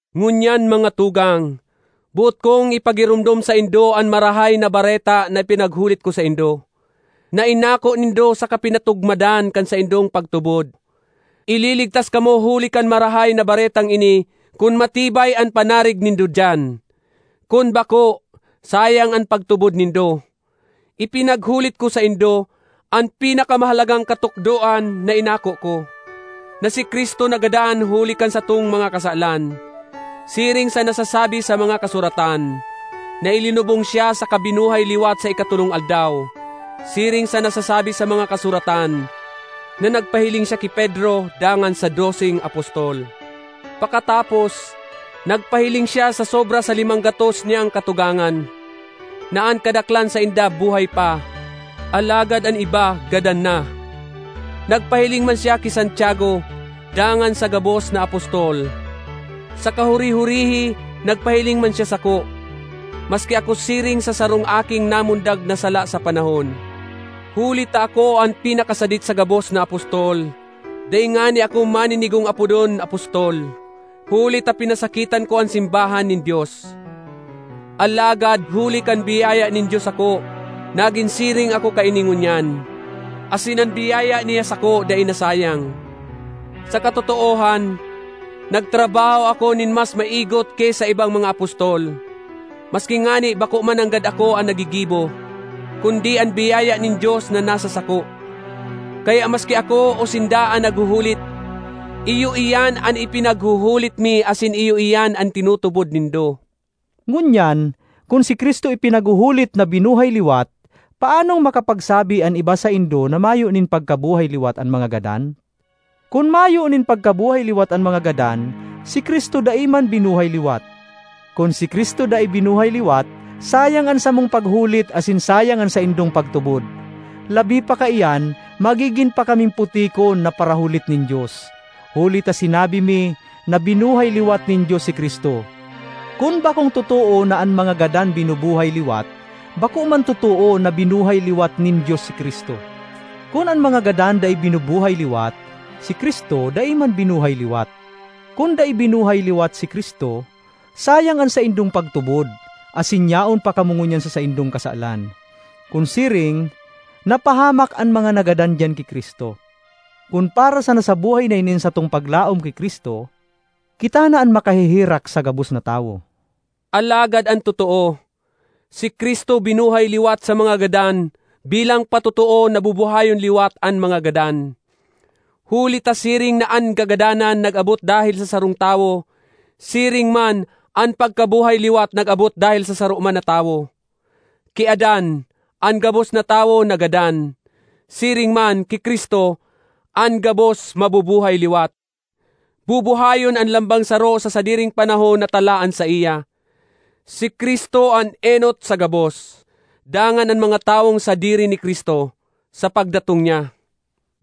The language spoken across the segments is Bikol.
Ngunyan, mga tugang, boot kong ipagiromdom saindo an Marahay na Bareta na ipinaghulit ko saindo, na inako nindo saka pinatugmadan kan saindong pagtubod. Ililigtas kamo huli kan Marahay na Baretang ini kun matibay an panarig nindo diyan; kun bako, sayang an pagtubod nindo. Ipinaghulit ko saindo an pinakamahalagang katukdoan na inako ko: na si Cristo nagadan huli kan satong mga kasalan, siring sa nasasabi sa mga Kasuratan; na ilinubong siya saka binuhay liwat sa ikatolong aldaw, siring sa nasasabi sa mga Kasuratan; na nagpahiling siya ki Pedro, dangan sa doseng apostol. Pakatapos, nagpahiling siya sa sobra sa limang gatos niyang katugangan, na an kadaklan sainda buhay pa, alagad an iba gadan na. Nagpahiling man siya ki Santiago, dangan sa gabos na apostol. Sa kahuri-hurihi nagpahiling man siya sako—maski ako siring sa sarong aking namundag na sala sa panahon. Huli ta ako an pinakasadit sa gabos na apostol—dai ngani ako maninigong apodon apostol, huli ta pinasakitan ko an simbahan nin Dios. Alagad huli kan biyaya nin Dios sako nagin siring ako kaini ngunyan, asin an biyaya niya sako dai nasayang. Sa katotoohan, nagtrabaho ako nin mas maigot ki sa ibang mga apostol, maski ngani bako mananggad ako an naggigibo, kundi an biyaya nin Dios na nasa sako. Kaya maski ako o sinda an naghuhulit, iyo iyan an ipinaghuhulit mi asin iyo iyan an tinutubod nindo. Ngunyan, kun si Cristo ipinaghuhulit na binuhay liwat, paanong makapagsabi an iba saindo na mayo nin pagkabuhay-liwat an mga gadan? Kun mayo nin pagkabuhay liwat an mga gadan, si Cristo dai man binuhay liwat. Kun si Cristo dai binuhay liwat, sayang an samong paghulit asin sayang an saindong pagtubod. Labi pa kaiyan, magigin pa kaming putikon na parahulit nin Dios, huli ta sinabi mi na binuhay liwat nin Dios si Cristo. Kun bakong totoo na an mga gadan binubuhay liwat, bako man totoo na binuhay liwat nin Dios si Cristo. Kun an mga gadan dai binubuhay liwat, si Cristo dai man binuhay liwat. Kun dai binuhay liwat si Cristo, sayang an saindong pagtubod, asin yaon pa kamo ngunyan sa saindong kasalan. Kun siring, napahamak an mga nagadan diyan ki Cristo. Kun para sana sa buhay na ini an satong paglaom ki Cristo, kita na an makaheherak sa gabos na tawo. Alagad an totoo, si Cristo binuhay liwat sa mga gadan bilang patotoo na bubuhayon liwat an mga gadan. Huli ta siring na an kagadanan nag-abot dahel sa sarong tawo, siring man, an pagkabuhay liwat nag-abot dahel sa saro man na tawo. Ki Adan, an gabos na tawo nagadan; siring man, ki Cristo, an gabos mabubuhay liwat. Bubuhayon an lambang saro sa sadiring panahon na talaan saiya: si Cristo an enot sa gabos, dangan an mga tawong sadiri ni Cristo, sa pagdatong niya.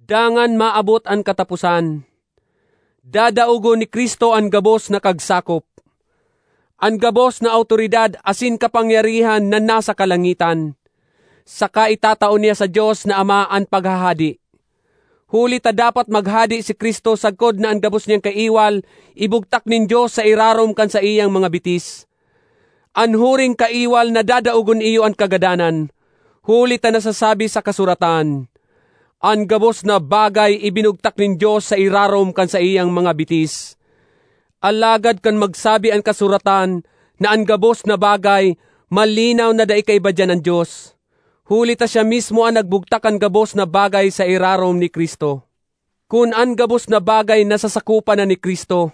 Dangan maabot an kataposan; dadaogon ni Cristo an gabos na kagsakop, an gabos na awtoridad asin kapangyarihan na nasa kalangitan, saka itatao niya sa Dios na Ama an paghahade. Huli ta dapat maghade si Cristo sagkod na an gabos niyang kaiwal ibugtak nin Dios sa irarom kan saiyang mga bitis. An huring kaiwal na dadaogon iyo an kagadanan. Huli ta nasasabi sa kasuratan, “An gabos na bagay ibinugtak nin Dios sa irarom kan saiyang mga bitis.” Alagad kan magsabi an kasuratan na “an gabos na bagay,” malinaw na dai kaiba diyan an Dios, huli ta siya mismo an nagbugtak kan gabos na bagay sa irarom ni Cristo. Kun an gabos na bagay nasasakopan na ni Cristo,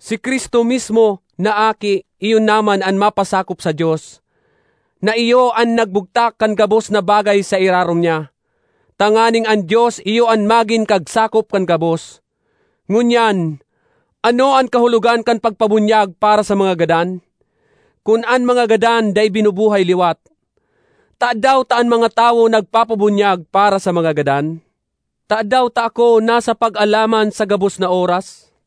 si Cristo mismo, na Aki, iyo naman an mapasakop sa Dios, na iyo an nagbugtak kan gabos na bagay sa irarom niya, tanganing an Dios iyo an magin kagsakop kan gabos. Ngunyan, ano an kahulogan kan pagpabunyag para sa mga gadan? Kun an mga gadan dai binubuhay liwat, tadaw ta an mga tawo nagpapabunyag para sa mga gadan? Tadaw ta ako nasa pag-alaman sa gabos na oras?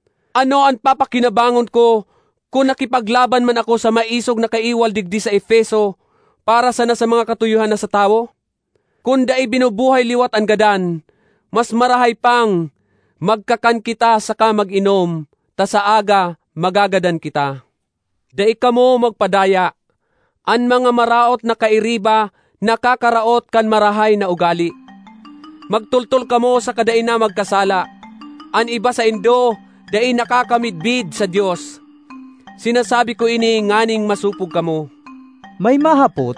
Ano an papakinabangon ko kun nakipaglaban man ako sa maisog na kaiwal digdi sa Efeso para sana sa mga katuyohan na sa tawo? Kun dai binubuhay liwat an gadan, mas marahay pang, “Magkakan kita saka mag-inom, ta sa aga magagadan kita.” Dai kamo magpadaya: “An mga maraot na kairiba, nakakaraot kan marahay na ugale.” Magtoltol kamo saka dai na magkasala. An iba saindo dai nakakamidbid sa Dios. Sinasabi ko ini nganing masopog kamo. May mahapot,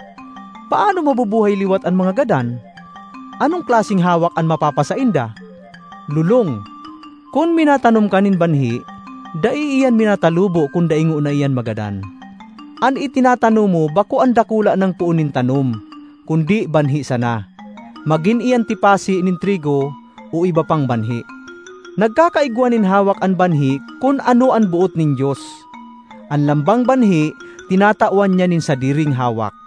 “Paano mabubuhay liwat an mga gadan? Anong klaseng hawak an mapapasainda?” Lolong! Kun minatanom ka nin banhi dai iyan minatalubo kun dai ngona iyan magadan. An itinatanom mo bako an dakula nang poon nin tanom, kundi banhi sana, magin iyan tipasi nin trigo, o iba pang banhi. Nagkakaigwa nin hawak an banhi kun ano an boot nin Dios. An lambang banhi tinatawan niya nin sadiring hawak.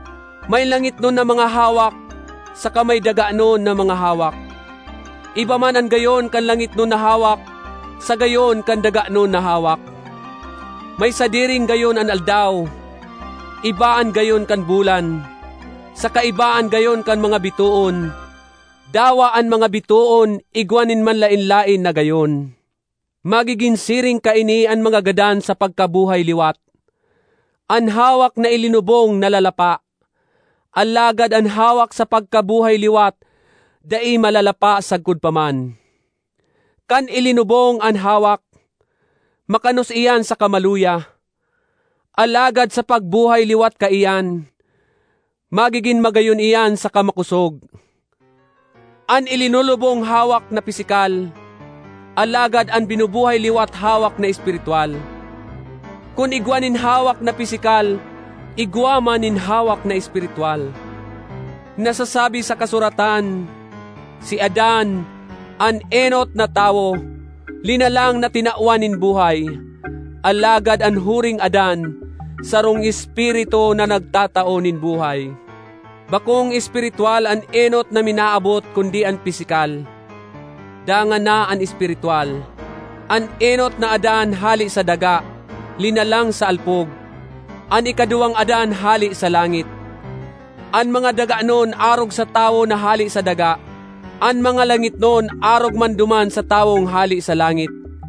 May langitnon na mga hawak saka may daganon na mga hawak. Iba man an gayon kan langitnon na hawak sa gayon kan daganon na hawak. May sadiring gayon an aldaw, iba an gayon kan bulan, saka iba an gayon kan mga bitoon; dawa an mga bitoon igwa nin manlaen-laen na gayon. Magigin siring kaini an mga gadan sa pagkabuhay liwat. An hawak na ilinubong nalalapa; alagad an hawak sa pagkabuhay liwat, dai malalapa sagkod pa man. Kan ilinubong an hawak, makanos iyan saka maluya; alagad sa pagbuhay liwat kaiyan, magigin magayon iyan saka makosog. An ilinulubong hawak na pisikal, alagad an binubuhay liwat hawak na espiritwal. Kun igwa nin hawak na pisikal igwa man nin hawak na espiritwal. Nasasabi sa kasuratan, “Si Adan, an enot na tawo, linalang na tinawan nin buhay”; alagad an huring Adan, sarong Espiritu na nagtatao nin buhay. Bakong espiritwal an enot na minaabot kundi an pisikal, dangan na an espiritwal. An enot na Adan hale sa daga, linalang sa alpog; an ikaduwang Adan hale sa langit. An mga daganon arog sa tawo na hale sa daga; an mga langitnon arog man duman sa tawong hale sa langit.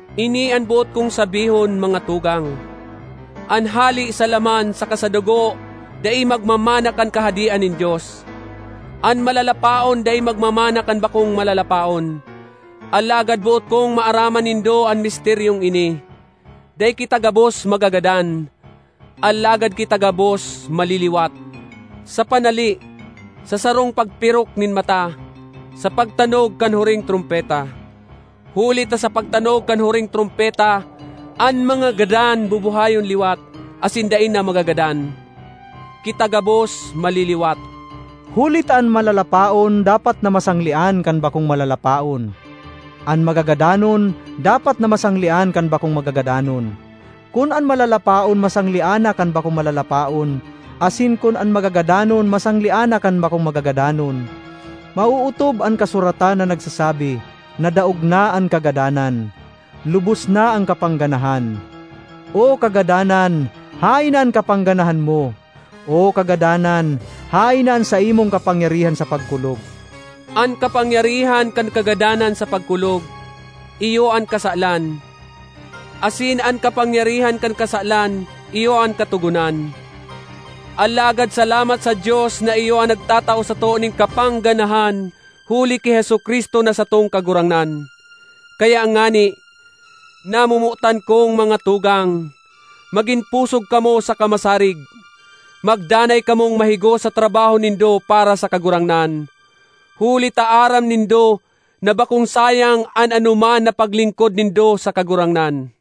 Ini an boot kong sabihon, mga tugang: an hale sa laman saka sa dugo dai magmamana kan Kahadean nin Dios; an malalapaon dai magmamana kan bakong malalapaon. Alagad boot kong maaraman nindo an misteryong ini: dai kita gabos magagadan, alagad kita gabos maliliwat sa panali—sa sarong pagpirok nin mata—sa pagtanog kan huring trompeta. Huli ta sa pagtanog kan huring trompeta, an mga gadan bubuhayon liwat asin dai na magagadan; kita gabos maliliwat, huli ta an malalapaon dapat na masanglean kan bakong malalapaon. An magagadanon dapat na masanglean kan bakong magagadanon. Kun an malalapaon masanglean na kan bakong malalapaon, asin kun an magagadanon, masanglean na kan bakong magagadanon, maootob an kasuratan na nagsasabi: “Nadaog na an kagadanan; lubos na an kapangganahan!” ”O Kagadanan, haen an kapangganahan mo? O Kagadanan, haen na an saimong kapangyarihan sa pagkulog?” An kapangyarihan kan kagadanan sa pagkulog, iyo an kasalan; asin an kapangyarihan kan kasalan iyo an Katogonan. Alagad salamat sa Dios na iyo an nagtatao sato nin kapangganahan huli ki Jesu-Cristo na satong Kagurangnan! Kaya ngani, namomotan kong mga tugang, magin pusog kamo saka masarig. Magdanay kamong mahigos sa trabaho nindo para sa Kagurangnan, huli ta aram nindo na bakong sayang an anoman na paglingkod nindo sa Kagurangnan.